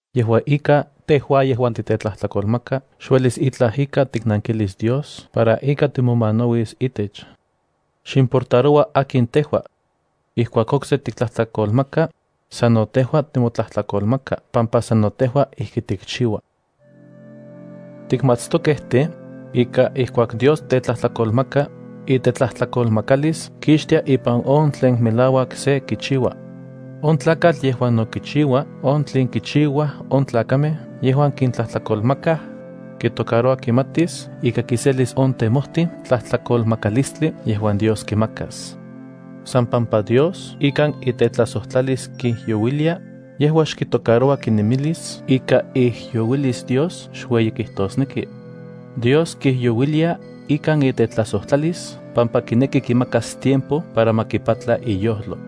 Yejua ika, tejua yejuan titetlajtlakolmaka xuelis itlaj ika tiknankilis Dios para ika timomanauis itech. Ximportaroua akin tejua. Ijkuak okse tiktlajtlakolmaka, sano tejua timotlajtlakolmaka pampa sano tejua ijki tikchiua. Tikmatstokej tej, ika ijkuak Dios tetlajtlakolmaka, itetlajtlakolmakalis kixtia ipan on tlen melauak se kichiua. On tlakatl yejuan no kichiua on tlen kichiuaj on tlakamej yejuan kintlajtlakolmakaj, kitocaroua kimatis ika kiselis on tejmoti tlajtlakolmakalistli yejuan Dios kimakas. San pampa Dios ikan itetlajsojtlalis kijyouilia, yejua xkitocaroua kinemilis ika iijyouilis Dios xueyi kijtosneki. Dios kijyouilia ikan itetlajsojtlalis pampa kineki kimakas tiempo para ma kipatla iyojlo.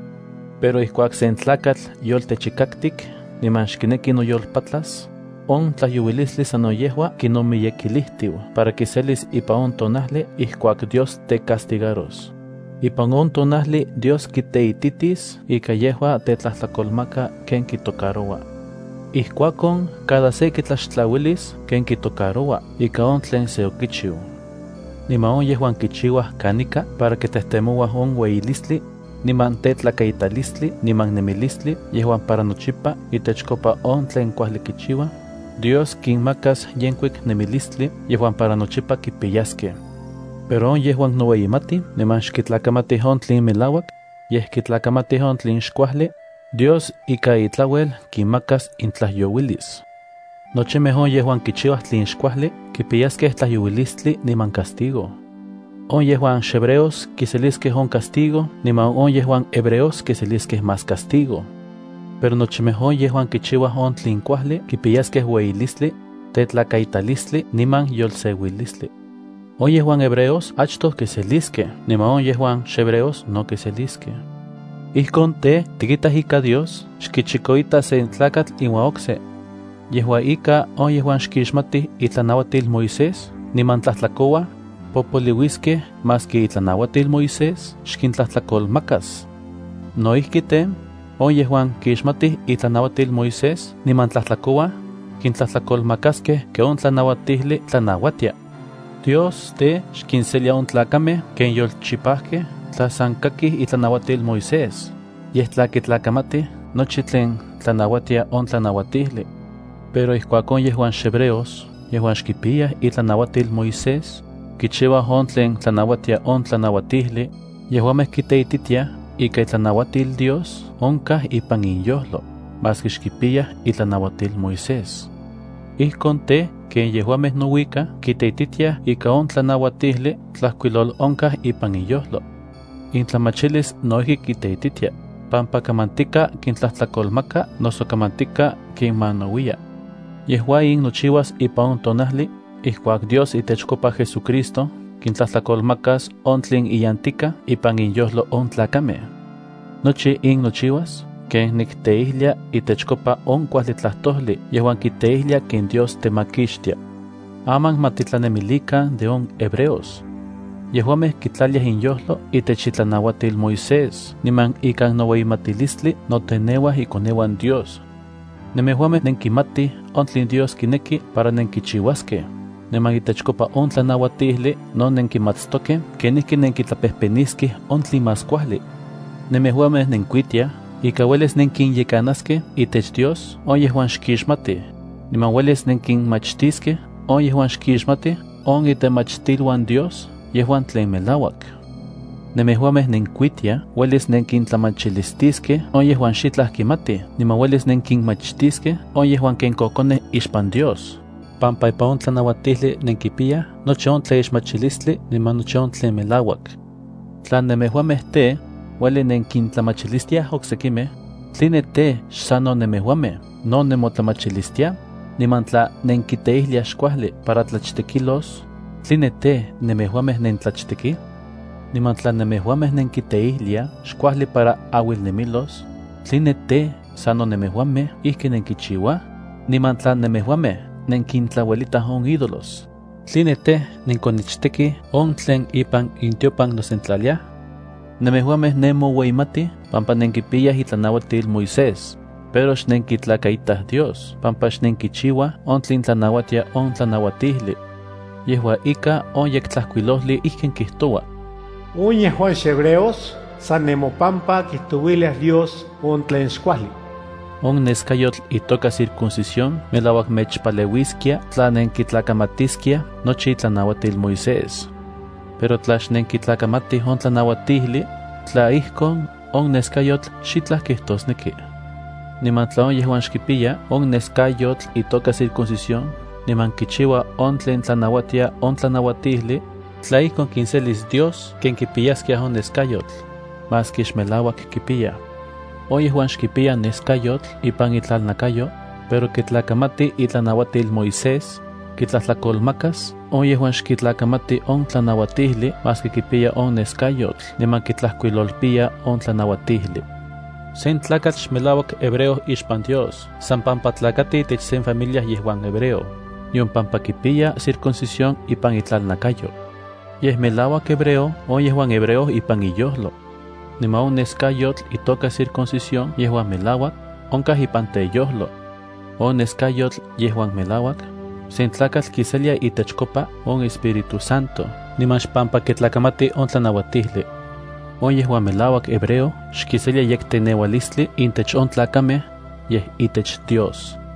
Pero ijkuak sen tlakatl yoltechikaktik niman xkineki noyolpatlas, on tlajyouilistli sano yejua kinomiyekilijtiu para kiselis ipan on tonajli ijkuak Dios tecastigaros. Ipan on tonajli Dios kiteititis ika yejua tetlajtlakolmaka ken kitocaroua. Ijkuakon, cada se kitlaxtlauilis ken kitocaroua ika on tlen se okichiu. Niman on yejuan kichiuaj kanika para kitejtemouaj on ueyilistli, niman tetlakaitalistli niman nemilistli yejuan para nochipa itechkopa on tlen kuajli kichiuaj, Dios kinmakas yenkuik nemilistli yejuan para nochipa kipiyaskej. Pero on yejuan noueyimatij niman xkitlakamatij on tlen melauak, yej kitlakamatij on tlen xkuajli, Dios ika itlauel kinmakas intlajyouilis. Nochimej on yejuan kichiuaj tlen xkuajli kipiyaskej tlajyouilistli niman castigo. On yejuan xhebreos kiseliskej on castigo niman on yejuan hebreos kiseliskej más castigo. Pero nochimej on yejuan kichiuaj on tlen kuajli kipiyaskej ueyilistli, tetlakaitalistli niman yolseuilistli. On yejuan hebreos achtoj kiseliskej niman on yejuan xhebreos no kiseliskej. Ijkon tej, tikitaj ika Dios xkichikoita sen tlakatl iuan okse. Yejua ika, on yejuan xkixmatij itlanauatil Moisés niman tlajtlakouaj, popoliuiskej maski itlanauatil Moisés xkintlajtlakolmakas. No ijki tej, on yejuan kixmatij itlanauatil Moisés niman tlajtlakouaj, kintlajtlakolmakaskej ken on tlanauatijli tlanauatia. Dios tej, xkinselia on tlakamej ken yolchipajkej tla san kakij itlanauatil Moisés, yej tla kitlakamatij nochi tlen tlanauatia on tlanauatijli. Pero ijkuak on yejuan xhebreos yejuan xkipiyaj itlanauatil Moisés, kichiuaj on tlen tlanauatia on tlanauatijli, yejuamej kiteititiaj ika itlanauatil Dios onkaj ipan inyojlo, maski xkipiyaj itlanauatil Moisés. Ijkon tej, ken yejuamej nouikaj kiteititiaj ika on tlanauatijli tlajkuilolonkaj ipan inyojlo. Intlamachilis no ijki kiteititia, pampa kamantika kintlajtlakolmaka noso kamantika kinmanauiya. Yejua in nochiuas ipan on tonajli ijkuak Dios itechkopa JesuCristo kintlajtlakolmakas on tlen iyantikaj ipan inyojlo on tlakamej. Nochi in nochiuas ken nikteijlia itechkopa on kuajli tlajtojli yejuan kiteijlia ken Dios temakixtia. Aman ma titlanemilikan de on hebreos. Yejuamej kitlaliaj inyojlo itech itlanauatil Moisés niman ikan noueyimatilistli noteneuaj ikoneuan Dios. Nemejuamej nenkimatij on tlen Dios kineki para nenkichiuaskej, niman itechkopa on tlanauatijli no nenkimatstokej kenijki nenkitlapejpeniskej on tlen más kuajli. Nejuamej nenkuitiaj ika uelis nenkinyekanaskej itech Dios on yejuan xkixmatij, niman uelis nenkinmachtiskej on yejuan xkixmatij on itemachtiluan Dios yejuan tlen melauak. Nemejuamej nenkuitiaj uelis nenkintlamachilistiskej on yejuan xitlaj kimatij niman uelis nenkinmachtiskej on yejuan ken kokonej ixpan Dios, pampa ipan on tlanauajtijli nenkipiyaj nochi on tlaixmachilistli niman nochi on tlen melauak. Tla nemejuamej tej, ueli nenkintlamachilistiaj oksekimej, ¿tline tej, xsano nemejuamej no nemotlamachilistiaj? Niman tla nenkiteijliaj xkuajli para tlachtekilos, ¿tline tej, nemejuamej no nentlachtekij? Niman tla nemejuamej nenkiteijliaj xkuajli para auilnemilos, ¿tline tej, sano nemejuamej ijki nenkichiuaj? Niman tla nemejuamej nenkintlauelitaj on ídolos, ¿tline tej, nenkonichtekij on tlen ipan intiopan nosentlalia? Nemejuamej nemoueyimatij pampa nenkipiyaj itlanauatil Moisés, pero xnenkitlakaitaj Dios pampa xnenkichiuaj on tlen tlanauatia on tlanauatijli. Yejua ika, on Yektlajkuilojli ijkin kijtoua: “On yejuan xhebreos san nemopampa kijtouiliaj Dios on tlen xkuajli.” On neskayotl itoka circuncisión melauak mechpaleuiskia tla nenkitlakamatiskiaj nochi itlanauatil Moisés. Pero tla xnenkitlakamatij on tlanauatijli, tla ijkon, on neskayotl xitlaj kijtosneki. Niman tla on yejuan xkipiya on neskayotl itoka circuncisión niman kichiua on tlen tlanauatia on tlanauatijli, tla ijkon kinselis Dios ken kipiyaskia on neskayotl, maski xmelauak kipiya. On yejuan xkipiya neskayotl ipan itlalnakayo, pero kitlakamati itlanauatil Moisés, kitlajtlakolmakas on yejuan xkitlajkamati on tlanauatilij maski kipiya on neskayotl niman kitlajkuilolpiya on tlanauatijli. Sen tlakatl xmelauak hebreo ixpan Dios san pampa tlakati itech sen familia yejuan hebreo, nion pampa kipiya circuncisión ipan itlalnakayo. Yej melauak hebreo on yejuan hebreo ipan iyojlo. Niman on neskayotl itoka circuncisión yejuan melauak, onkaj ipan teyojlo. On neskayotl yejuan melauak, sen tlakatl kiselia itechkopa on Espíritu Santo niman xpampa kitlakamati on tlanauatijli. On yejuan melauak hebreo xkiselia yekteneualistli intech on tlakamej, yej itech Dios.